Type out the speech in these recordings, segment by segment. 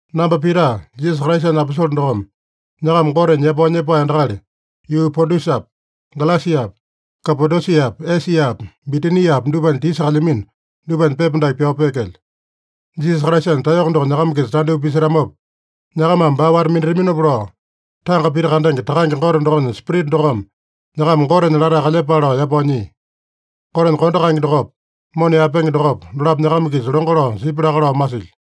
Namba Pita, Jisasa Kraisanya aposole dokome, nyakama Goteme yapao nyepae endakali, yuu Pontusapi, Galesiapi, Kapadosiapi, Esiapi, Bitiniapi dupanya tisa kalyamino, dupanya pepa dake pyao peekelyo. Jisasa Kraisanya taeyoko doko nyakama-kisa tandyoo pisetamopa, nyakamame baa wata-minataminopa lao, tanga pita kandenge Takange Gote dokonya Spirita dokome nyakama Gotenya latae kalyepale lao yapao nyia. Gotenya kondo kaenge dokopa, mona yaepenge dokopa, dolapo nyakama-kisa longo lao sipya laka lao masilyo.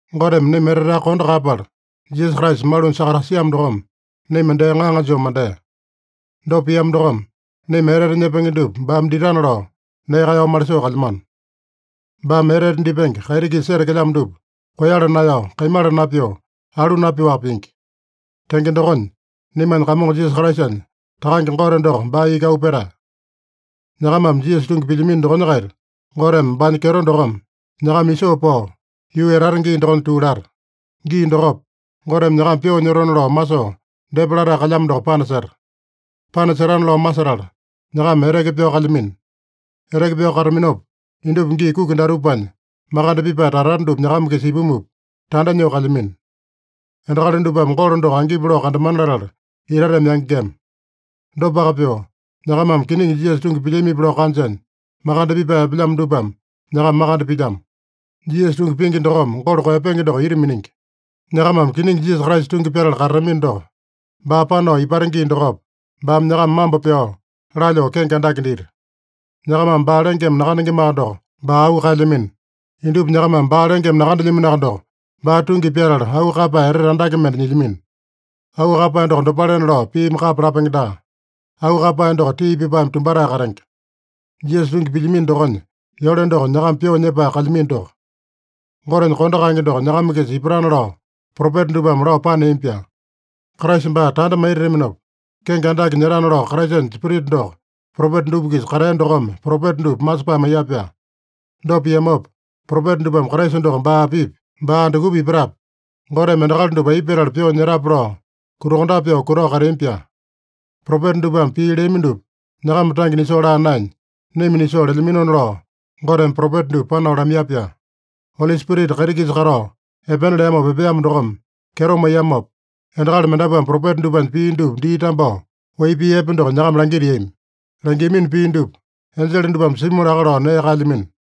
Goteme naima eteteaka kondo kaeyapala, Jisasa Kraisa malunya sakatasiamo dokome, naima dee ŋaŋa joo mandea. Dopa piamo dokome, naima etete nyepenge dupa baame ditana lao, nee kaeyao malisoo kalyamano. Baame etete dipenge kaiti-kisa setekelyamo dupa koeyala naeyao, kaimala napyoo, aloo napyoaka pingi. Tenge dokonya, naimanya Kamongo Jisasa Kraisanya Takange Gote doko baa iki auu petae. Nyakamame Jisasa tungi pilyamino dokonya-kaita, Goteme baanya kyeto dokome nyakama isoo pao, yuu etata gii dokonya tuu lata. Gii dokopa, Goteme nyakama pyoo nyotona lao masoo depa latae kalyamo doko panaseta. Panasetana lao masetala, nyakama eteke pyao kalyamino. Eteke pyao kataminopa, indupa gii kuki datupanya makande pipae tata-tata dupa nyakama-kisa ipumupa, tanda nyoo kalyamino. Endakali dupame golo doko angipi kandamana latala itateme yangengema. Dopaka pyoo, nyakamame kiningi Jisasa tungi pilyamipi lao kanjanya, makande pipae epelyamo dupame nyakama makande pilyamo. Jisasa tungi pingi dokome golo koeyapenge doko ita miningi. Nyakamame kiningi Jisasa Kraisa tungi pyatala katatamino doko, baa panao ipata gii dokopa, baame nyakama mambo pyao, lalyoo kenge andake dita. Nyakamame baa lengeme nakandengemaka doko, baa auu kaelyamino. Indupa nyakamame baa lengeme nakandelyaminoaka doko, baa tungi pyatala auu kaeyapae etete andake mende nyilyamino. Auu kaeyapae doko dopalena lao piimi kapa lapenge daa. Auu kaeyapae doko tii pipaeme tumbatae katenge. Jisasa tungi pilyamino dokonya yole doko, nyakama pyoo nyepae kalyamino doko. Gotenya kondo kaenge doko nyakama-kisa ipatana lao propeta dupame lao paneami-pyaa. Kraisa baa tanda maitataminopa, kenge andake nyetana lao Kraisanya Spirita doko, propeta dupa-kisa katea dokome propeta dupa masepae maiya-pyaa. Dopa piamopa, propeta dupame Kraisa doko baa apipi, baa andukupa ipatape, Goteme endakali dupa aipa petala pyoo nyetape lao, kutakondape pyoo kutao kateami-pyaa. Propeta dupame pii leami dupa, nyakama tange nisoo laa naenya, naima nisoo lelyaminona lao, Goteme propeta dupa panao lamaiya-pyaa. Oli Spirita kaiti-kisa katao epena leamopa epeamo dokome kyeto maiyamopa, endakali mendapuame propeta dupanya pii dupa dii tambao, wai pii epe doko nyakama langitiami. Langiamino pii dupa enjele dupame simu laka lao nee kaelyamino.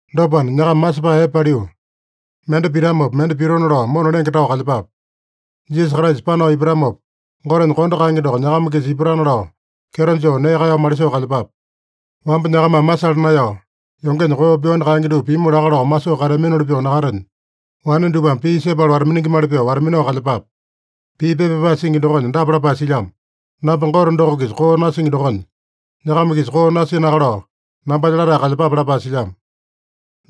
Dopana, nyakama masepae epe paliu, mende pitamopa mende pitona lao mona lenge tao kalyepape. Jisasa Kraisa panao ipatamopa, Gotenya kondo kaenge doko nyakama-kisa ipatana lao, kyeto joo nee kaeyao malisoo kalyepape. Wamba nyakamame masala naeyao, yongenya koo pyoani kaenge dupa pimu laka lao masoo kateaminoli pyoo nakatenya, wane dupame pii sepala wata-miningimali pyoo wata-minao kalyepape. Pii pepa pyapae singi dokonya dapa lapae silyamo: “Namba Gote doko-kisa koo nasingi dokonya, nyakama-kisa koo nasinaka lao nambanya latae kalyepape” lapae silyamo.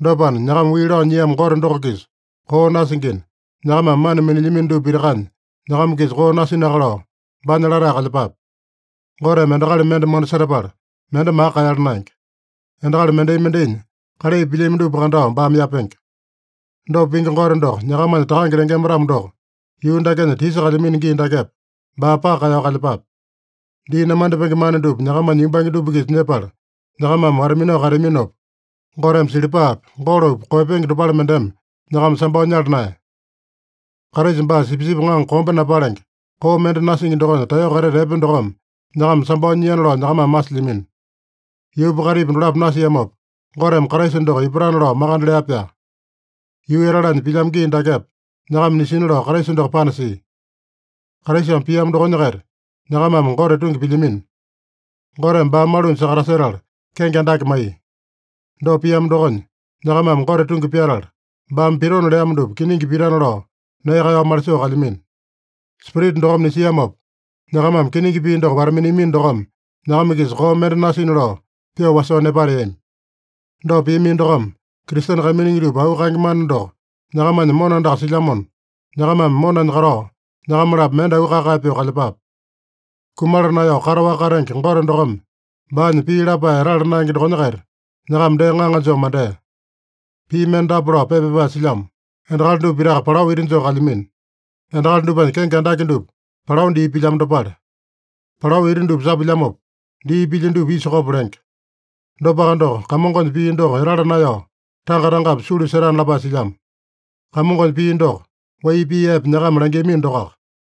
Dopana, nyakama wii lao nyiamo Gote doko-kisa koo nasingina, nyakamame mana minilyamino dupa pitakanya nyakama-kisa koo nasinaka lao, baanya latae kalyepape. Goteme endakali mende mona setapala, mende maka kaeyala naenge. Endakali mendai-mendainya kalai pilyami dupa kandao baame yapenge. Dopa pingi Gote doko nyakamanya Takange lengema-tamo doko, yuu dakenya tisa kalyamino gii dakepa, baa paka kaeyao kalyepape. Dii namandipenge mana dupa nyakamanya yumbange dupa-kisa nyepala, nyakamame wata-minao kateaminopa, Goteme silipapi, golopi koeyapenge dopale mendeme nyakama sambao nyala naeya. Kraisa baa sipisipi ŋaŋa kombe napalenge, koo mende nasingi dokonya taeyoko etete epe dokome nyakama sambao nyiana lao nyakamame masilyamino. Yuupa kaitipa dolapo nasiamopa, Goteme Kraisa doko ipatana lao makande lea-pyaa. Yuu etalanya pilyamo gii dakepa, nyakama nisina lao Kraisa doko panasia. Kraisame piamo dokonya-kaita nyakamame Gote tungi pilyamino. Goteme baa malunya sakatasetala kenge andake maiya. Dopa piamo dokonya, nyakamame Gote tungi pyatala, baame pitona leamo dupa kiningi pitana lao nee kaeyao malisoo kalyamino. Spirita dokome nisiamopa, nyakamame kiningi pii doko wata-miniamino dokome, nyakama-kisa koo mende nasina lao pyoo wasoo nepateami. Dopa piamino dokome, Kristene kaiminingi dupa auu kaenge mana doko nyakamanya mona andaka silyamona, nyakamame monanya katao nyakama-lapo mende auu kae-kae pyoo kalyepape. Kumala naeyao kataowaka katenge Gote dokome baanya pii lapae etala naenge dokonya-kaita nyakama dee ŋaŋa joo mandea. Pii mende dapa lao pepa pyapae silyamo: “Endakali dupa pitaka palao ita joo kalyamino. Endakali dupanya kenge andake dupa palao dii pilyamo dopale. Palao ita dupa sapuilyamopa, dii pilya dupa isa kopo lenge. Dopaka doko, Kamongonya pii doko etala naeyao, tanga-tangapi sulu setana” lapae silyamo. Kamongonya pii doko, wai pii epe nyakama langiamino dokoaka.